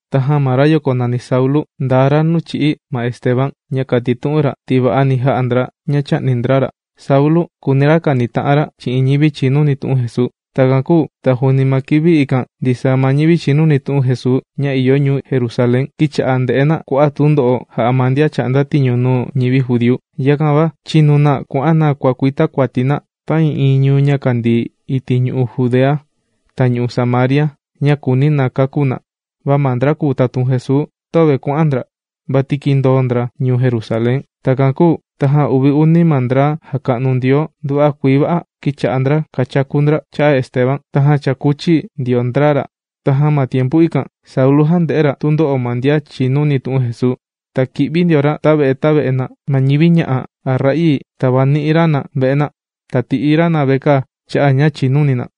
Tajan ma rayoko nàni Saulu, ndaa ra nuu chī'í ma Esteban ña kàtitu'un ra ti va'ani jā'a ndra ña chā'ni ndra ra. Saulu, kùuni ra kanita'an ra chi'in ñivi chìnuni tu'un Jesuu Takan kūu ta juuni ma kivi ikan ndisaa ma ñivi chìnuni tu'un Jesuu ña ìyo ñuu Jerusalén, kīcha'a na ndè'e na kua'a' tundo'o jà'a ma ndian chà'nda tiñu nuu ñivi judíu. Yakan va chīnu na kuà'an na kuàkuita kuati na ta'ii'iin ñuu ña kàndii iti' ñu'u' Judea ta ñu'u' Samaria ña kùuni na kakú na. Va ma ndra kùu tatun Jesuu, töve kuà'an ndra, vati kīndoo ndra ñuu Jerusalén. Takan kūu tajan uvi uni ma ndra jàka'nu Ndioo nduva'a kuii va'a, kīcha'a ndra kàchaku ndra cha'a' Esteban, tajan chākuchi ndio ndra ra. Ta ma tiempu ikan Saulu jànde'e ra tundo'o ma ndian chìnuni tu'un Jesuu. Ta kì'vi ndio ra tave'e tave'e na, ma ñivi ña'a' a ra'ii, tàvani'i ra na ve'e na, ta tì'i ra na vekaa cha'a' ña chìnuni na.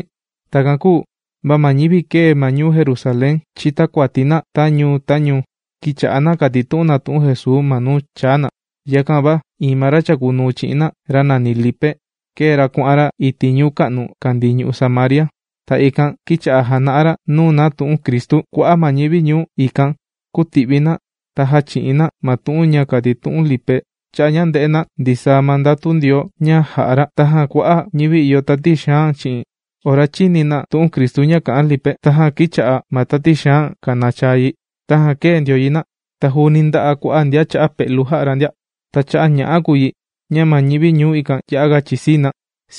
Takan kūu va ma ñivi kēe ma ñuu Jerusalén chītakuati na ta ñuu ta ñuu, kīcha'a na kàtitu'un na tu'un Jesuu ma nuu chāa na. Yakan va iin ma ra chàkunuu chi'in na, ra nàni Lipe kēe ra kuà'an ra iti' ñuu ka'nu kàndii ñu'u' Samaria. Ta ikan kīcha'a jàna'a ra nuu na tu'un Cristu. Kua'a' ma ñivi ñuu ikan, kūti'vi na ta jāchi'in na ma tu'un ña kàtitu'un Lipe, cha'a' ña ndē'e na ndisaa ma ndatu Ndioo ña jà'a ra. Tajan kua'a' ñivi ìyo tati xaan chi'in, ora chīni na tu'un Cristu ña kà'an Lipe, tajan kīcha'a ma tati xaan kànachaa yi, tajan kēe ndio yi na. Ta juuni ndā'a kua'a' ndian cha'a pe'lu jà'a ra ndia. Ta cha'a' ña'a kùu yi ña ma ñivi ñuu ikan ya'a ga chìsii na.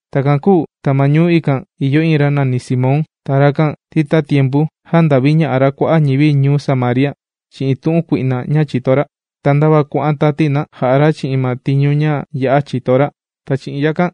Takan kūu ta ma ñuu ikan ìyo iin ra nàni Simón. Ta rakan ti tatiempu jānda'viña'a ra kua'a' ñivi ñuu Samaria chi'in tu'un kui'na ña chìto ra. Ta ndava kuà'an tati na jà'a ra chi'in ma tiñu ña ya'a chìto ra. Ta chi'in yakan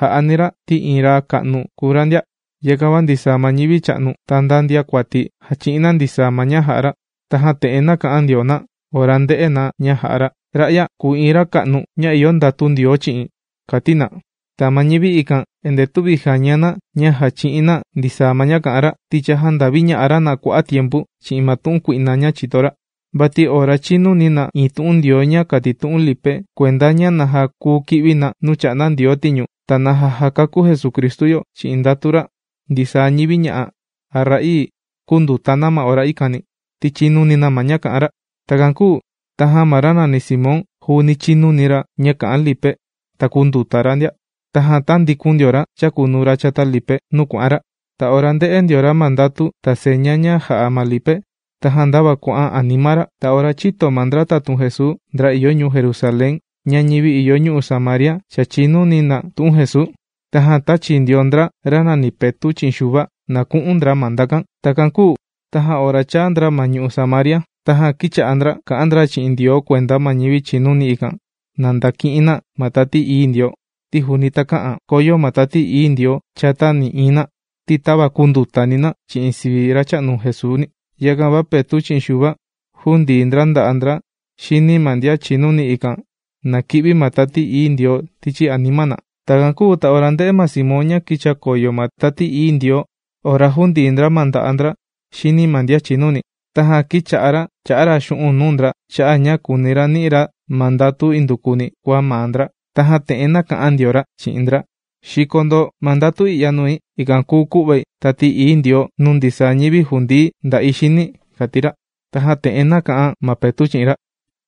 jà'ani ra ti iin ra ka'nu kùu ra ndia. Yakan va ndisaa ma ñivi cha'nu, ta nda ndiakuati jàchi'in na ndisaa ma ña jà'a ra. Tajan te'en nāka'an ndio na ora ndē'e na ña jà'a ra: ―Ra'ya kùu iin ra ka'nu ña ìyo ndatu Ndioo chi'in ―kàti na. Ta ma ñivi ikan endee tüvi jàña na ña jàchi'in na ndisaa ma ña kà'an ra, ti cha jānda'viña'a ra na kua'a' tiempu chi'in ma tu'un kui'na ña chìto ra. Vati ora chīnuni na iin tu'un Ndioo ña kàtitu'un Lipe kuenda ña naja kuu ki'vi na nuu chà'nda Ndioo tiñu ta naja jàkakú Jesucristu yo chi'in ndatu ra, ndisaa ñivi, ña'a' a ra'ii, kūnduta na ma ora ikani, ti chīnuni na ma ña kà'an ra. Takan kūu tajan ma ra nàni Simón juuni chīnuni ra ña kà'an ma Lipe, ta kūnduta ra ndia. Tajan tāndikun ndio ra chàkunuu ra chata Lipe, nuu kuà'an ra. Ta ora ndè'e ndio ra ma ndatu ta seña ña jà'a ma Lipe tajan ndava kuà'an anima ra. Va ora chīto ma ndra tatun Jesuu, ndra ìyo ñuu Jerusalén, ña ñivi ìyo ñu'u' Samaria cha chìnuni na tu'un Jesuu, tajan tāchi ndio ndra ra nàni Petu' chi'in Xuva na ku'un ndra ma ndakan. Takan kūu tajan ora chāa ndra ma ñu'u' Samaria, tajan kīcha'a ndra kà'an ndra chi'in Ndioo kuenda ma ñivi chìnuni, ikan na ndaki'in na ma Tati Ií Ndioo, ti juuni takä'an koyo ma Tati Ií Ndioo chata nï'iin na, ti tava kūndutani na chi'in sivi Racha'nu Jesuuni. Yakan va Petu' chi'in Xuva, jūndii ndra nda'a' ndra xini ma ndian chìnuni ikan, na ki'vi ma Tati Ií Ndioo tichi anima na. Takan kūu ta ora ndē'e ma Simón ña kīchakoyo ma Tati Ií Ndioo ora jūndii ndra ma nda'a' ndra xini ma ndian chìnuni, tajan kīcha'a ra chà'a ra xu'un' nuu ndra cha'a' ña kùuni ra ni'i ra ma ndatu indukuni kua maa ndra. Tajan te'en nāka'an ndio ra chi'in ndra: ―Xiko ndo ma ndatu i'ya nui ikan kùu ku'vai Tati Ií Ndioo nuu ndisaa ñivi jùndii̱ nda'i xini ―kàti ra. Tajan te'en nāka'an ma Petu' chi'in ra: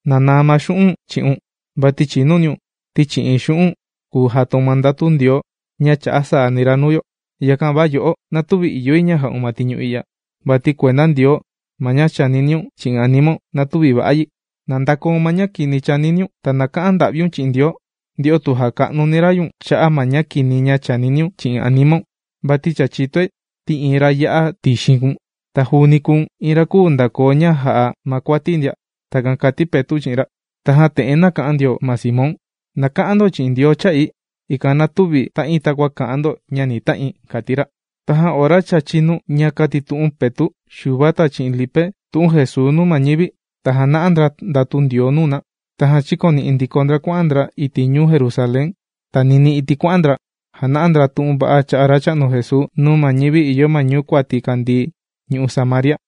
―¡Na naa ma xu'u̱n' chi'un!, vati chìniniun ti chi'in xu'un' kùu jataun ma ndatu Ndioo ña chà'a saani ra nuu yo. Yakan va yo'o, na tüvi ìyo yi ña ja'un ma tiñu i'ya. ¡Vati kuenda Ndioo ma ña chàniniun chi'in animaun na tüvi va'a yi! ¡Na ndakoun ma ña kini ña chàniniun! Ta na ka'an nda'viun chi'in Ndioo, nde'o tu jaka'nuni ra ñu̱n cha'a' ma ña kini ña chàniniun chi'in animaun. Vati cha chìtoi ti iin ra ya'a tixin kùu̱n, ta juuni kùu̱n iin ra küu ndakoo ña jà'a ma kuati ndia. ―Takan kàti Petu' chi'in ra. Tajan te'en nāka'an ndio ma Simón: ―Na ka'an ndo chi'in Ndioo cha'i, ikan na tüvi ta'in takua kà'an ndo ña ni ta'in ―kàti ra. Tajan ora cha chīnu ña kàtitu'un Petu', Xuva ta chi'in Lipe tu'un Jesuu nuu ma ñivi, ta jàna'a ndra ndatu Ndioo nuu na. Tajan chīkoni'i ndiko ndra kuà'an ndra iti' ñuu Jerusalén. Ta ninii iti' kuà'an ndra jàna'a ndra tu'un va'a cha'a' Racha'nu Jesuu nuu ma ñivi ìyo ma ñuu kuati kàndii ñu'u' Samaria.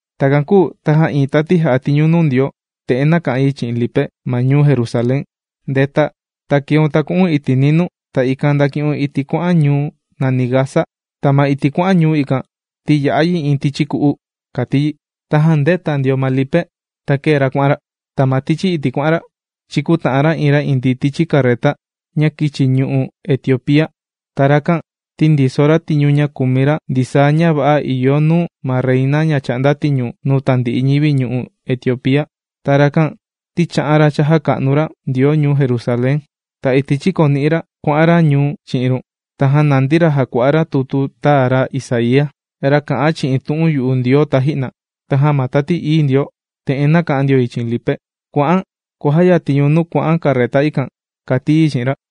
Takan kūu tajan iin tati jà'a tiñu nuu Ndioo, te'en nāka'an yi chi'in Lipe ma ñuu Jerusalén: ―¡Ndeta! Ta keun ta ku'u̱n iti' ninuu ta ikan ndaki'un iti' kuà'an ñuu nàni Gaza. Ta ma iti' kuà'an ñuu ikan, ti ya'a yi iin tichi ku'u ―kàti yi. Tajan ndēta ndio ma Lipe ta kēe ra kuà'an ra. Ta ma tichi iti' kuà'an ra, chīkuta'an ra iin ra indii tichi carreta ña kīchi ñu'u' Etiopía. Ta rakan ti ndiso ra tiñu ña kùmi ra ndisaa ña va'a ìyo nuu ma reina ña chà'nda tiñu nuu tandi'i ñivi ñu'u' Etiopía. Ta rakan ti chā'an ra chājaka'nu ra Ndioo ñuu Jerusalén. Ta iti' chīkoni'i ra kuà'an ra ñuu chi'in run, tajan nàndi ra jàkua'a ra tutu tāa ra Isaía, ra kà'an chi'in tu'un yu'u Ndioo taji'na. Tajan ma Tati Ií Ndioo, te'en nàka'an ndio yi chi'in Lipe: ―Kua'an kuàjayatiun ñu̱n nuu kuà'an carreta ikan ―kàti yi chi'in ra.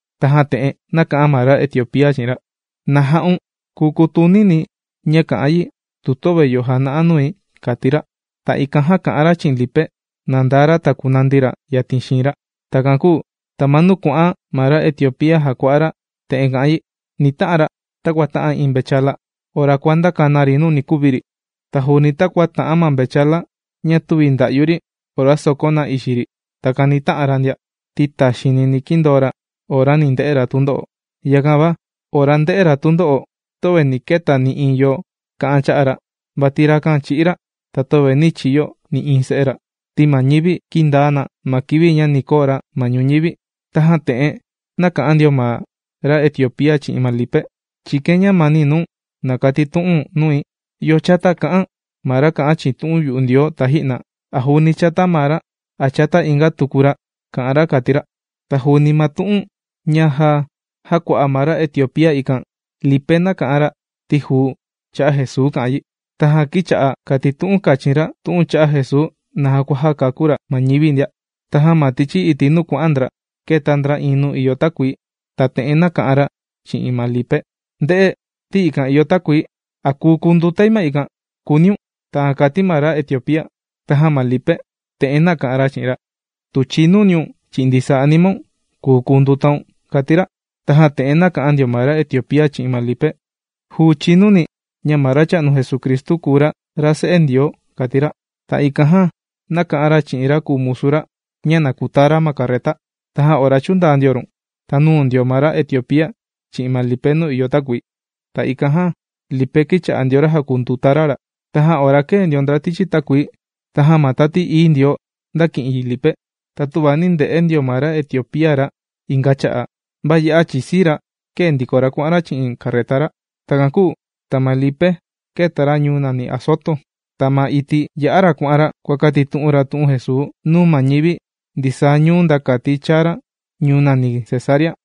Tajan te'en nāka'an ma ra Etiopía chi'in ra: ―¿Na ja'un kùu kutunini̱ ña kà'an yi, tuva töve yo jàna'a nui? ―kàti ra. Ta ikan jan kà'an ra chi'in ma Lipe, na ndaa ra ta kunandi ra yatin xiin ra. Takan kūu ta ma nuu kuà'an ma ra Etiopía jàkua'a ra te'en kà'an yi: Ni ta'an ra takua tà'an iin mvechala ora kuàndaka na ri nuu ni kuvi ri. Ta juuni takua tà'an ma mvechala ña tüvi ndà'yu ri ora sòkon na ixi ri, takan ni tà'an ra ndia, ti taxiini ni kindoo ra ora ni nde'e ra tundo'o. Yakan va ora ndē'e ra tundo'o töve nī keta nï'iin yo kà'an cha'a' ra. Vati rakan chī'í ra, ta töve nī chiyo nï'iin se'e ra, ti ma ñivi kīndaa na ma kivi ña ni koo ra ma ñuñivi. Tajan te'en nāka'an ndio ma ra Etiopía chi'in ma Lipe: ―Chìkain ñamani nuu̱n na katitu'u̱n nui, ¿yo chata kā'an ma ra kà'an chi'in tu'un yu'u Ndioo taji'na? ¿A juuni chata maa ra, a chata inga tuku ra kà'an ra? ―kàti ra. Ta juuni ma tu'un ña já jākua'a ma ra Etiopía ikan, Lipe nāka'an ra ti juu cha'a' Jesuu kà'an yi, tajan kīcha'a kàtitu'un kachin ra tu'un cha'a' Jesuu naja kua jàkakú ra ma ñivi ndia. Tajan ma tichi iti' nuu kuà'an ndra, kēta ndra iin nuu ìyo takuii, ta te'en nāka'an ra chi'in ma Lipe: ―¡Nde'e! Ti ikan ìyo takuii. ¿A kùu kundutai ma ikan?, kùuniun. ―Takan kàti ma ra Etiopía. Tajan ma Lipe te'en nāka'an ra chi'in ra: ―Tu chìnuniun chi'in ndisaa animaun, kùu kundutaun ―kàti ra. Tajan te'en nāka'an ndio ma ra Etiopía chi'in ma Lipe: ―Juu chìnuni̱ ña ma Racha'nu Jesucristu kùu ra, ra Se'e Ndioo ―kàti ra. Ta ikan jan nāka'an ra chi'in ra kùu musu ra, ña na kutaa ra ma carreta. Tajan ora chūndaa ndio run, ta nūu ndio ma ra Etiopía chi'in ma Lipe nuu ìyo takuii. Ta ikan jan Lipe kīcha'a ndio ra jàkunduta ra ra. Tajan ora kēe ndio ndra tichi takuii, tajan ma Tati Ií Ndioo ndāki'in yi Lipe. Ta töva nī nde'e ndio ma ra Etiopía ra inga cha'a'. Va ya'a chìsii ra kēe ndiko ra kuà'an ra chi'in carreta ra. Takan kūu ta ma Lipe kēta ra ñuu nàni Azoto. Ta ma iti' yà'a ra kuà'an ra kuàkatitu'un ra tu'un Jesuu nuu ma ñivi ndisaa ñuu nda kati chāa ra ñuu nàni Cesarea.